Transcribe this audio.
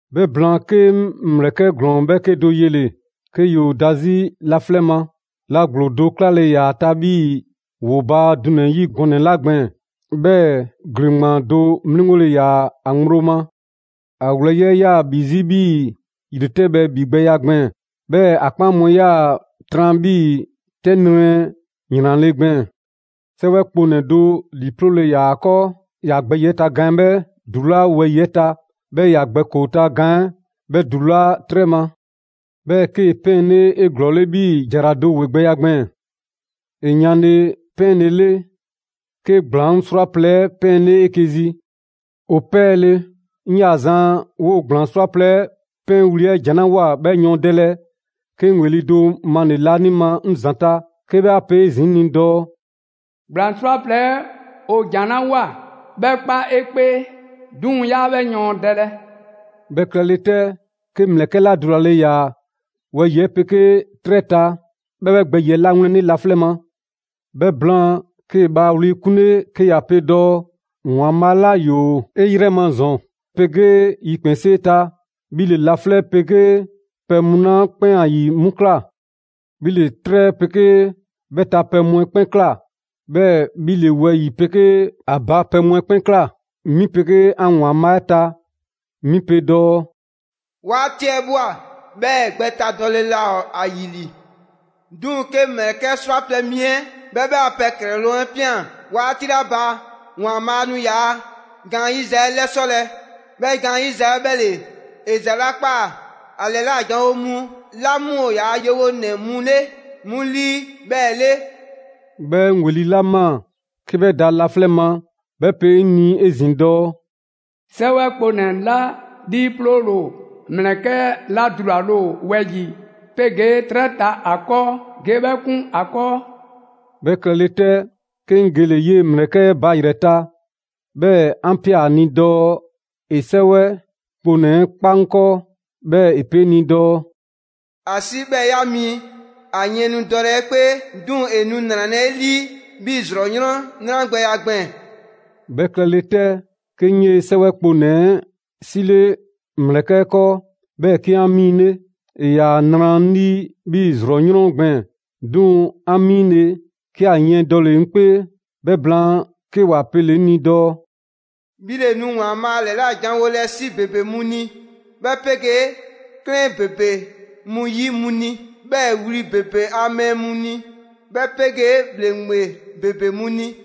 'Bhɛ blaan, 'ke 'ŋ ‑mlɛkɛ' ‑glɔɔ 'bhɛɛke do yele‑ 'ke ‑yoo da 'zi laflɛ' ma. La ‑gblo do 'klale‑ ‑yaa ‑a ta 'bhii‑ ‑woo baa dunɛ‑ 'yi gɔnɛ‑ 'la gbɛɛn‑, 'bhɛɛ‑ ‑gleŋgbaan do 'mliŋgole ‑yaa ‑a ŋgblo ma. ‑A wlɛyi' 'ɛ 'yaa‑ ‑bhi 'zi 'bhii‑ ‑yretɛbhɛ ‑bhigbɛya gbɛɛn‑; 'bhɛɛ‑ ‑a 'kpaan mu 'ɛ 'yaa‑ tran 'bhii‑ 'tɛ nrɛ ‑wlɛnle' gbɛɛn‑. 'Sɛwɛ kponɛ‑ do ‑liiploole ‑yaa ‑a 'kɔɔ. ‑Ya gbɛ ‑yiɛ' ta gaan 'ɛ 'bhɛ ‑dulaa' wɛyi‑ 'ɛ ta, 'bhɛɛ‑ ‑ya gbɛ ‑koo ta gaan 'ɛ 'bhɛ ‑dulaa' 'trɛ ma. 'Bhɛɛ‑ 'kee‑ 'pɛɛnle 'eglɔɔle 'bhii‑ ‑jara do ‑wegbɛya gbɛɛn‑. ‑E yanle 'pɛɛnlele, 'ke ‑gblaŋ' 'srwaplɛ‑ 'ɛ 'pɛɛle 'eke‑ zi. ‑O 'pɛɛle‑, 'ŋ 'yaa‑ zan 'woo‑ ‑gblaŋ' 'srwaplɛ‑ 'pɛɛwli‑ 'ɛ ‑jan 'la ꞊woa 'bhɛ yɔɔndɛlɛ, 'ke 'ŋ ‑weli' do male‑ laanima 'ŋ ‑zanta', 'ke 'bhɛ ‑a pe 'zi 'ŋ ni dɔɔ: «‑Gblaŋ' 'srwaplɛ‑ 'ɛ ‑o ‑jan 'la ꞊woa, 'bhɛ 'kpa 'e 'kpee, 'duŋ‑ 'yaa 'bhɛ yɔɔndɛlɛ.» 'Bhɛ klɛle 'tɛ, 'ke 'ŋ ‑mlɛkɛ' 'la dulale ꞊ya wɛyi‑ 'pegee 'trɛ 'ɛ ta, 'bhɛ 'bhɛ gbɛyiɛ 'lawlɛnle laflɛ' ma. 'Bhɛ blaan 'kee‑ bhaa wli 'kunle 'ke ‑ya pe dɔɔ: ‑Waanbhaa' 'la 'yoo‑ 'e 'yrɛ ma ‑zɔn 'pegee yikpɛnsee ta, 'bhi ‑le laflɛ' 'pegee pɛ mu 'la 'kpɛn ‑a ‑yi 'mu ꞊kla. 'Bhi ‑le 'trɛ 'pegee 'bhɛ ta pɛ mu 'ɛ 'kpɛn ꞊kla. 'Bhɛɛ‑ 'bhi ‑le wɛyi‑ 'pegee ‑a ba pɛ mu 'ɛ 'kpɛn ꞊kla. 'Mi 'pegee 'an ‑Waanbhaa' 'ɛ ta 'mi pe dɔɔ: «'Waati 'ɛ ꞊bhwa, 'bhɛɛ‑ gbɛtadɔle laa ‑o ‑a ‑yi ‑li. 'Duŋ‑, 'ke ‑mlɛkɛ' 'srwaplɛ‑ mi 'ɛ 'bhɛ 'bhɛ a pɛ ‑klɛloŋ' 'ɛ ꞊pian 'waati 'la ba, ‑Waanbhaa' nu ‑yaa' gaanyiza 'ɛ 'lɛsɔlɛ. 'Bhɛ gaanyiza 'ɛ 'bhɛ ‑le ‑e ‑za 'la ꞊kpaa ‑a ‑lɛla' janwo mu 'la 'mu ‑o ‑yaa' yewonɛ mu 'le 'mu 'lii 'bhɛɛ‑ 'le.» 'Bhɛɛ‑ 'ŋ ‑weli' 'la ꞊maa 'ke 'bhɛ da laflɛ' ma, 'bhɛ pe 'ŋ ni 'ezin‑ dɔɔ: «'Sɛwɛ kponɛ‑ 'la 'liiploole ‑o ‑mlɛkɛ' 'la dulale ‑o wɛyi‑ 'pegee 'trɛ 'ɛ ta ‑a 'kɔɔ, ge 'bhɛ 'kun ‑a 'kɔɔ.» 'Bhɛ klɛle 'tɛ, 'ke 'ŋ gele‑ 'yee‑ ‑mlɛkɛ' 'ɛ ba ‑yrɛ ta, 'bhɛɛ‑ 'an ꞊pia ‑a ni dɔɔ ‑e 'sɛwɛ kponɛ‑ 'ɛ 'kpa 'ŋ 'kɔɔ. 'Bhɛɛ‑ ‑e pe 'ŋ ni dɔɔ: «‑A 'si 'bhɛɛ‑ 'ya miin. ‑A yiɛn nu dɔlɛ 'e 'kpee, 'duŋ‑ ‑e nu ‑nralɛ' 'e 'lii 'bhii‑ ‑zrɔ 'yrɔn 'nragbɛya gbɛɛn‑.» 'Bhɛ klɛle 'tɛ, 'ke 'ŋ 'yee‑ 'sɛwɛ kponɛ‑ 'ɛ 'sile ‑mlɛkɛ' 'ɛ 'kɔɔ, 'bhɛɛ‑ 'ke 'an 'miinle. ‑E ‑yaa nra 'ŋ 'lii 'bhii‑ ‑zrɔ 'yrɔn gbɛɛn‑; 'duŋ‑ 'an 'miinle‑, 'ke ‑a yiɛn dɔle‑ 'ŋ 'kpee. 'Bhɛ blaan, 'ke ‑wa pele‑ 'ŋ ni dɔɔ: «'Bhi ‑le nu ‑Waanbhaa' ‑lɛla' janwolɛ 'si ‑bebe mu ni, 'bhɛ 'pegee 'klɛɛn ‑bebe mu ‑yi mu ni, 'bhɛɛ‑ wli ‑bebe a mɛɛ mu ni, 'bhɛ 'pegee ‑bhleŋgbe ‑bebe mu ni.»